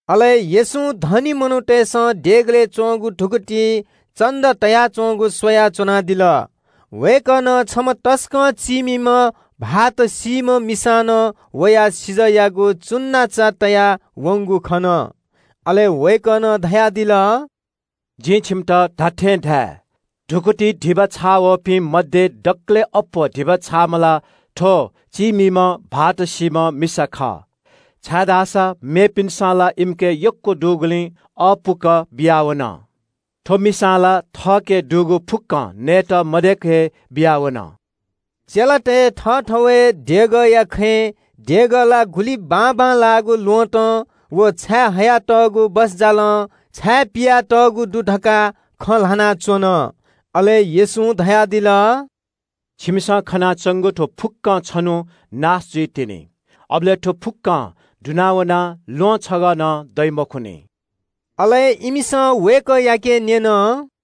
अले येशूं धनी मनूतय्‌सं देगलय् च्‍वंगु धुकुतिइ धिबा तयाच्‍वंगु स्‍वया च्‍वनादिल। वय्‌कलं छम्‍ह तसकं चीमिम्‍ह भाःत सीधुंकूम्‍ह मिसां नं वयाः सिजःयागु धिबा तयावंगु खन। अले वय्‌कलं धयादिल – “जिं छिमित धात्‍थें धाये – धुकुतिइ धिबा छाःवःपिं मध्‍ये दकलय् अप्‍वः धिबा छाःम्‍ह ला थ्‍व चीमिम्‍ह भाःत सीधुंकूम्‍ह मिसा खः। छाय्‌धाःसा मेपिन्‍सं ला इमिके यक्‍व दुगुलिं अःपुक बियावन। थ्‍व मिसां ला थःके दुगु फुक्‍कं नयेत मदय्‌क हे बियावन।” चेलातय् थःथवय् देगःया खँय् देगः ला गुलि बाबांलाःगु ल्‍वहँतं व छायेहयातःगु बसजालं छाय्‌पिया तःगु दु धकाः खँ ल्‍हानाच्‍वन। अले येशूं धयादिल – “छिमिसं खनाच्‍वंगु थ्‍व फुक्‍कं छन्‍हु नाश जुइतिनि, अबलय् थ्‍व फुक्‍कं दुना वनाः ल्‍वहं छगः नं दइ मखुनि।” अले इमिसं वय्‌कःयाके न्‍यन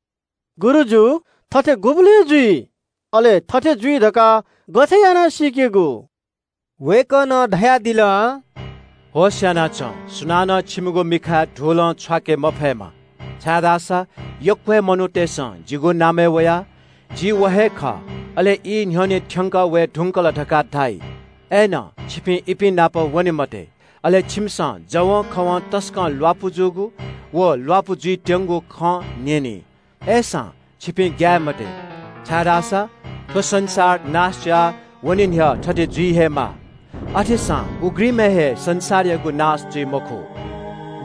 – “गुरुजु, थथे गुबलय् जुइ? अले थथे जुइ धकाः गथे याना सीकेगु?” वय्‌कलं धयादिल – “होश‍ यानाच्‍वँ, सुनानं छिमिगु मिखाय् धुलं छ्वाके मफयेमा, छाय्‌धाःसा यक्‍व हे मनूतय्‌सं जिगु नामय् वयाः – ‘जि व हे खः’ अले ‘ई न्‍ह्यःने थ्‍यंकः वये धुंकल’ धकाः धाइ। अय्‌नं छिपिं इपिं नाप वने मते। अले छिमिसं जवंखवं तसकं ल्‍वापु जूगु व ल्‍वापु जुइत्‍यंगु खँ न्‍यनी। अय्‌सां छिपिं ग्‍याये मते, छाय्‌धाःसा थ्‍व संसार नाश जुयावने न्‍ह्यः थथे जुइ हे माः। अथेसां उघ्रिमय् हे संसारयागु नाश जुइ मखु।”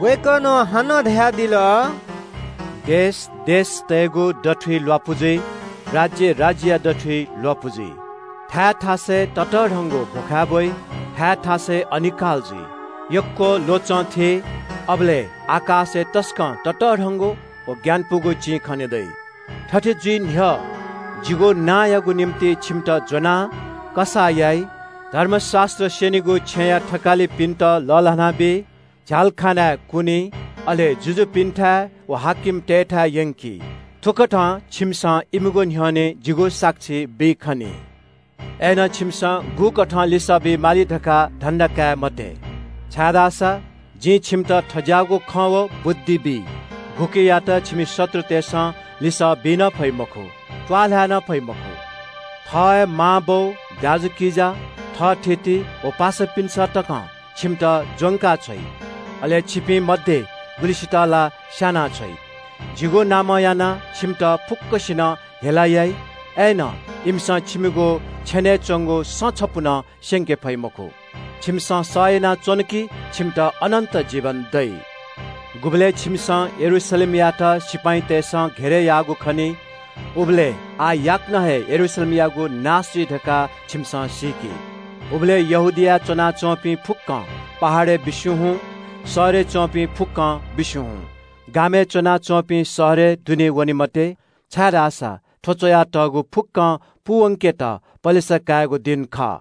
वय्‌कलं हानं धयादिल – “देश देशतय्‌गु दथुइ ल्‍वापु जुइ। राज्‍य राज्‍यया दथुइ ल्‍वापु जुइ। थाय् थासय् ततःधंक भ्‍वखाय् ब्‍वइ, थाय् थासय् अनिकाल जुइ, यक्‍व ल्‍वचं थी, अबलय् आकाशय् तसकं ततःधंगु व ग्‍यानापुगु चिं खने दइ। “थथे जुइ न्‍ह्यः जिगु नांयागु निंतिं छिमित ज्‍वनाः कसाः याइ, धर्मशास्‍त्र स्‍यनीगु छेँया थकालिपिन्‍त लःल्‍हानाबी, झ्‍यालखानाय् कुनी, अले जुजुपिन्‍थाय् व हाकिमतय्‌थाय् यंकी। थुकथं छिमिसं इमिगु न्‍ह्यःने जिगु साक्षी बी खनी। अय्‌नं छिमिसं गुकथं लिसः बी माली धकाः धन्‍दा काये मते, छाय्‌धाःसा जिं छिमित थज्‍याःगु खँ व बुद्धि बी, गुकियात छिमि शत्रुतय्‌सं लिसः बी नं फइ मखु, त्‍वाःल्‍हाय् नं फइ मखु। थः हे मांबौ, दाजुकिजा, थःथिति व पासापिन्‍सं तकं छिमित ज्‍वंका छ्वइ, अले छिपिं मध्‍ये गुलिसित ला स्‍यानाछ्वइ। जिगु नामं यानाः छिमित फुक्‍कसिनं हेला याइ। अय्‌नं इमिसं छिमिगु छेनय् च्‍वंगु सँ छपु नं स्‍यंके फइ मखु। छिमिसं सह यानाच्‍वन धाःसा छिमित अनन्‍त जीवन दइ।” “गुबलय् छिमिसं यरूशलेमयात सिपाइँतय्‌सं घेरय् याःगु खनी, उबलय् आः याकनं हे यरूशलेमयागु नाश जुइ धकाः छिमिसं सीकि। उबलय् यहूदियाय् च्‍वनाच्‍वंपिं फुक्‍कं पहाडय् बिस्‍युं हुँ, शहरय् च्‍वंपिं फुक्‍कं बिस्‍युं हुँ, गामय् च्‍वनाच्‍वंपिं शहरय् दुने वने मते। छाय्‌धाःसा थ्‍व धर्मशास्‍त्रय् च्‍वयातःगु फुक्‍कं पूवंकेत पलेसा काइगु दिं खः।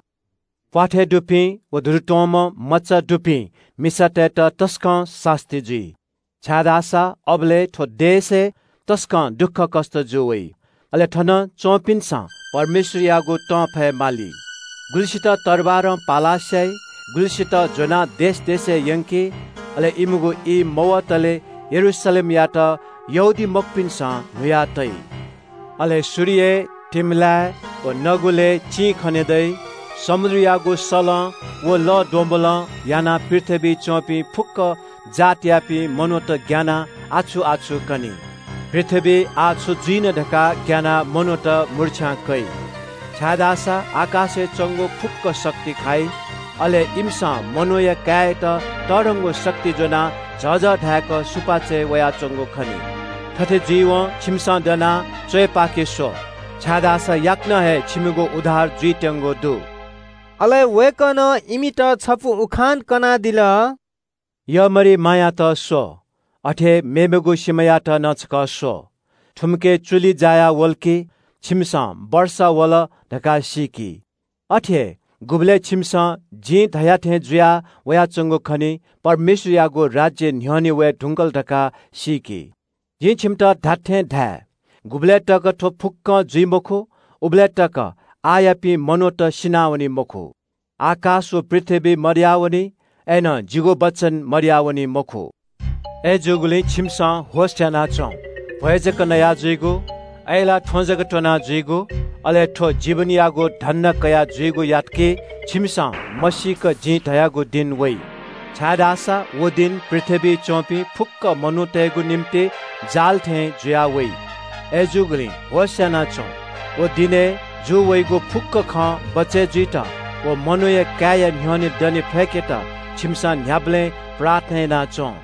प्‍वाथय् दुपिं व दुरुत्‍वंम्‍ह मचा दुपिं मिसातय्‌त तसकं सास्‍ती जुइ। छाय्‌धाःसा अबलय् थ्‍व देशय् तसकं दुःखकष्‍ट जू वइ, अले थन च्‍वंपिन्‍सं परमेश्‍वरयागु तं फयेमाली। गुलिसित तरवारं पालाः स्‍याइ, गुलिसित ज्‍वनाः देश देशय् यंकी, अले यहूदीमखुपिनिगु ई पूमवंतले इमिसं यरूशलेमयात न्‍हुत्तुन्‍हुया तइ।” “अले सूर्यलय्, तिमिलाय् व नगुलय् चिं खने दइ। समुद्रयागु सलं व लःद्वम्‍बलं यानाः पृथ्‍वीइ च्‍वंपिं फुक्‍क जातयापिं मनूत ग्‍यानाः आछु-आछु कनी। पृथ्‍वीइ आः छु जुइन धकाः ग्‍यानाः मनूत मुर्च्‍छां कइ, छाय्‌धाःसा आकाशय् च्‍वंगु फुक्‍क शक्ति खाइ। अले इमिसं मनूया काय्‌यात तःधंगु शक्ति ज्‍वनाः झःझः धाय्‌क सुपाँचय् वयाच्‍वंगु खनी। थथे जुइवं छिमिसं दनाः च्‍वय् पाखे स्‍व, छाय्‌धाःसा याकनं हे छिमिगु उद्धार जुइत्‍यंगु दु।” अले वय्‌कलं इमित छपु उखान कनादिल – “यःमरिमायात स्‍व, अथे हे मेमेगु सिमायात नं छकः स्‍व। थुमिके चुलि जायावल कि, छिमिसं ‘तांन्‍वःगु ई वल’ धकाः सीकी। अथे हे गुबलय् छिमिसं जिं धया थें जुया वयाच्‍वंगु खनी, परमेश्‍वरयागु राज्‍य न्‍ह्यःने वये धुंकल धकाः सीकि। जिं छिमित धात्‍थें धाये – गुबलय् तक थ्‍व फुक्‍कं जुइ मखु, उबलय्‌तक आःयापिं मनूत सिनावनी मखु। आकाश व पृथ्‍वी मदयावनी, अय्‌नं जिगु वचन मदयावनी मखु।” “अय्‌जूगुलिं छिमिसं होश‍ यानाच्‍वँ। भ्‍वय् जक नया जुइगु, अय्‌लाः थ्‍वँ जक त्‍वना जुइगु, अले थ्‍व जीवनयागु धन्‍दा कयाः जुइगु याना जुल धाःसा छिमिसं मसीक जिं धयागु दिं वइ। छाय्‌धाःसा व दिं पृथ्‍वीइ च्‍वंपिं फुक्‍क मनूतय्‌गु निंतिं तक्‍यंकीगु जाल थें जुयाः वइ। अय्‌जूगुलिं होश‍ यानाच्‍वँ। व दिनय् जू वइगु फुक्‍क खं बचय् जुइत व मनूया काय्‌या न्‍ह्यःने दने फय्‌केत छिमिसं न्‍ह्याबलें प्रार्थना याना च्‍वँ।”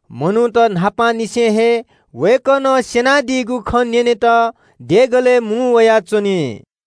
मनूत सुथय् न्‍हापांनिसें हे वय्‌कलं स्‍यनादीगु खँ न्‍यनेत देगलय् मुं वयाच्‍वनी।